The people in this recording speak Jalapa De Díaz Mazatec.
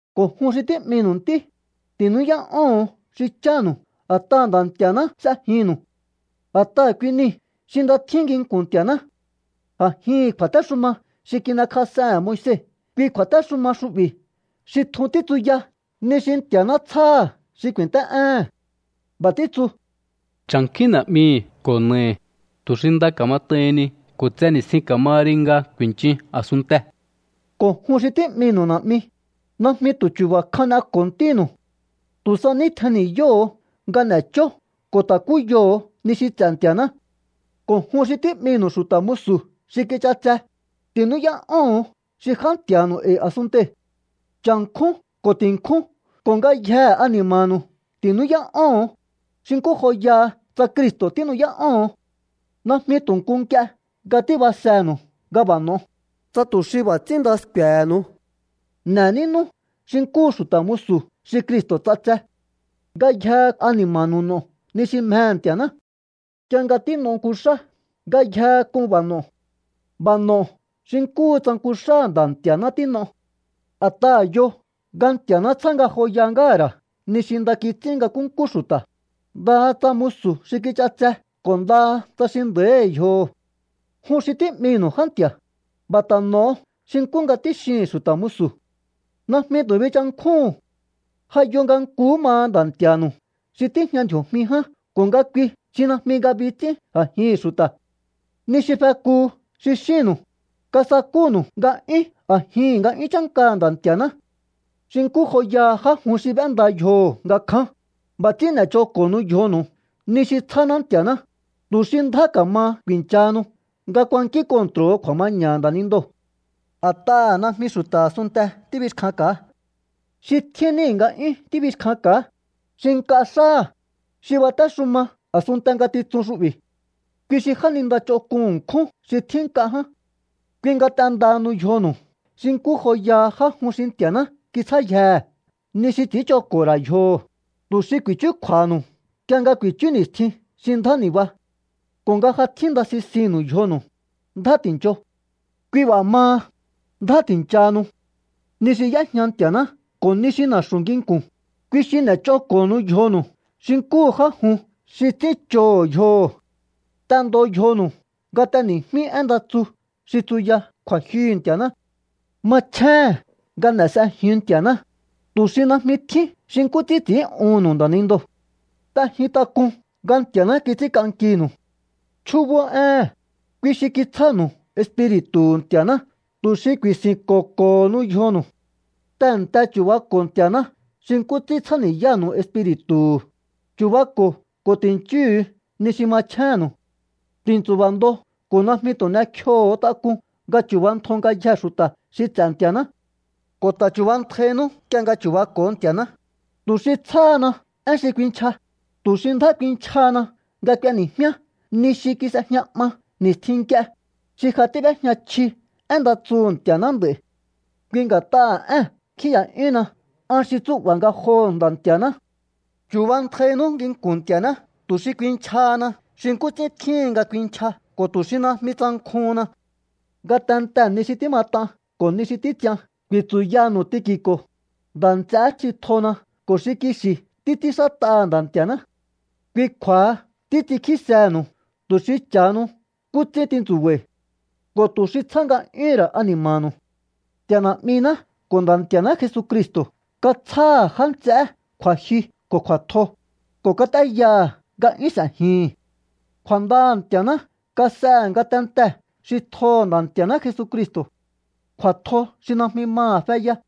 Ko̱ jun xi tí'minu̱u ntí, ti̱nú'yá'óho̱on xi chánu̱u a̱t'aha̱ Nda̱ Nti̱a̱ná s'ejinnu̱u. A̱t'aha̱ kui niu̱ xi nda tjín nginku̱n Nti̱a̱ná. A̱jihi̱n kju̱a̱téxuma xi kin'ekjas'ehe̱n Moise kui kju̱a̱téxuma xu'bi̱ xi tjun títsuya ni xi Nti̱a̱ná tsjáha̱ xi ku̱i̱nt'é'éhe̱n. B'a̱ títsu: “Cha̱nkjúín na̱'mihi̱ ko̱ na̱ahi̱ tu̱ xi nda ka̱mat'aihinni ko̱ tse ni̱stjin ka̱maha ri nga ku̱i̱nchin a̱sunntee̱.” Ko̱ jun xi tí'minu̱u na̱'mi, najmi tu̱ chu̱ba̱ kjan n'eko̱o ntínu̱u. Tu̱ sa ní tjen ni̱yóho̱o nga n'e̱chó ko̱ ta̱kúyoho̱o ni xi ts'e̱ Nti̱a̱ná. Ko̱ jun xi tí'minu̱u xu̱ta̱ musu̱ xi kich'atse, ti̱nú'yá'óho̱on xi já nti̱a̱nu̱u e̱i̱ a̱sunntei̱. Cha̱nkjún ko̱ ti̱nkjún ko̱ ngayjehe ani̱ma̱nu̱u ti̱nú'yá'óho̱on, xi nkú joyaha tsa Cristo̱ tínu'yá'óho̱on. Najmi tu̱ nku nk'ie nga tíbasenu̱u nga b'a̱ n'o̱o, tsa tu̱ xi b'a̱ ts'ín nda sku̱e̱he̱nu̱u. N'e̱ nínú xi nkúhu xu̱ta̱ musu̱ xi Cristo̱ ts'atse. Ngayjehe ani̱ma̱nu̱u n'o̱o ni xi mjehe̱ Nti̱a̱ná. Nk'ie nga tín'o nku xá, ngayjehe k'un b'a̱ no̱o. B'a̱ no̱o xi nkúhu tsa nku xáha̱ Nda̱ Nti̱a̱ná tín'o. A̱t'aha̱ yo nga Nti̱a̱ná tsjá ngajoya ngáha̱ ra̱ ni xi nda kits'ín nga nkúnkú xu̱ta̱, ndaha tsa musu̱ xi kich'atse ko̱ ndaha tsa xi nda̱íhi̱ yjoho̱. Jun xi tí'minu̱u já nti̱a̱, b'a̱ ta̱ n'o̱o xi nkú nga tíxihi̱n xu̱ta̱ musu̱. Najmi tu̱ binchankjúhu̱un. Ja yo nga nkuhú maha Nda̱ Nti̱a̱nu̱u xi tíjña ndji̱o̱jmi ján ko̱ nga kui xi najmi ngabi ts'ín a̱jihi̱n xu̱ta̱. Ni xi fekuhu xi xínnu̱u, kasakúnu̱u nga'yún a̱jihi̱n nga'yún chánkaha̱ Nda̱ Nti̱a̱ná. Xi nkú joyaha já jun xi b'énda yjoho̱ nga kján, b'a̱ ts'ín n'e̱ch'oko̱honu yjonu̱u ni xi tsjáná Nti̱a̱ná, tu̱ xi ndjá ka̱ma ku̱i̱nchahanu nga kuankín kontro̱ho̱ kju̱a̱maña̱ha̱ nda̱nindoo̱. A̱t'aha̱ najmi xu̱ta̱ a̱sunnte tíbixkjanka̱á. Xi tjín níhi̱ nga'yún tíbixkjanka̱á, xi nk'a xáha̱, xi batéxuma a̱sunnte ngatitsun xu'bi̱. Kui xi jáninda ch'onk'un ṉkjún xi tjín nk'a ján. Kui nga t'endahanu yjonu̱u xi nkú joyaha já jun xi Nti̱a̱ná kitsjáyjehe̱ ni xi ts'i̱ínch'oko̱ho̱ ra̱ yjoho̱, tu̱ xi ku̱i̱chúkju̱a̱ha̱nu̱u nk'ie nga ku̱i̱chú ni̱stjin xi ndjá ni̱ba. Ko̱ nga ja tjínda sisinnu̱u yjonu̱u, ndjá ti̱ncho. Kui b'a̱ maha, ndjá ti̱nchahanu. Ni xi y'éjña Nti̱a̱ná ko̱ ni xi na̱xu̱ nginku̱n, kui xi n'e̱ch'oko̱honu yjonu̱u xi nkúhu já jun xi ts'ínch'oho̱ yjoho̱. T'endo yjonu̱u nga t'eni̱jmíú én nda tsu xi tsuya kju̱a̱jyuhu̱ Nti̱a̱ná. Machjéhe̱n nga n'e̱ s'ejiun Nti̱a̱ná, tu̱ xi najmi tjín xi nkú ts'ín ts'i̱ín'uhu̱nnu̱u nda̱nindoo̱. T'ejin tak'un nga Nti̱a̱ná kits'ínk'ankinu̱u. Chjúbó éhe̱n, kui xi kitsjánu̱u Espiri̱tu̱hu̱ Nti̱a̱ná tu̱ xi ku̱i̱si̱nko̱ko̱honu yjonu̱u. Tehe̱nte chu̱bako̱o Nti̱a̱ná xi nkú ts'ín tsjáni̱yánu̱u Espiri̱tu̱hu̱. Chu̱bako̱o ko̱ ti̱nchíhu̱u ni xi machjénnu̱u. Ti̱ntsu̱ba̱ ndo ko̱ najmi tu̱ n'ekjioho̱o tak'un nga chu̱bantjo ngayjee̱ xu̱ta̱ xi ts'e̱ Nti̱a̱ná. Ko̱ ta̱ chu̱bantjainú nk'ie nga chu̱bako̱o Nti̱a̱ná, tu̱ xi tsjáhana én xi kuinchja, tu̱ xi ndjá kuinchjahana nga k'ueni̱jmíá ni xi kis'ejña 'ma ni̱stjin nk'ie, xi ja tíb'éjña chji én nda tsuhu̱ Nti̱a̱ná nd'a̱i̱. Kui nga̱t'aha̱ ée̱n kjíi̱ya'yúhunna an xi tsú'ba̱ ngajoho̱ Nda̱ Nti̱a̱ná. Chu̱bantjainú nginku̱n Nti̱a̱ná tu̱ xi kuinchjahana xi nkú ts'ín tjíhin nga kuinchja ko̱ tu̱ xi najmi tsankjuhunna. Ngatentee̱ ni xi tímat'an ko̱ ni xi títs'ian ku̱i̱tsu̱yanu̱u Tiki̱ko̱, nda̱ nts'eé xi tjona ko̱ xi kixi̱ títs'ínxát'aha̱ Nda̱ Nti̱a̱ná. Kui kju̱a̱ha títs'inkjísehe̱nu̱u tu̱ xi cha̱hanu nkú ts'ín tintsu̱ba̱i̱ ko̱ tu̱ xi tsjá nga'yúhu̱n ra̱ ani̱ma̱nu̱u. Nti̱a̱ Na̱'miná ko̱ Nda̱ Nti̱a̱ná Jesucristo̱ katsjáha̱ já nts'eé kju̱a̱jyu ko̱ kju̱a̱tjo, ko̱ kat'éyaha̱ nga 'yún s'e̱jihi̱n. Kju̱a̱ndaha̱ Nti̱a̱ná kas'ehe̱ ngatentee̱ xi tjoho̱ Nda̱ Nti̱a̱ná Jesucristo̱, kju̱a̱tjo xi najmi maha̱ feya.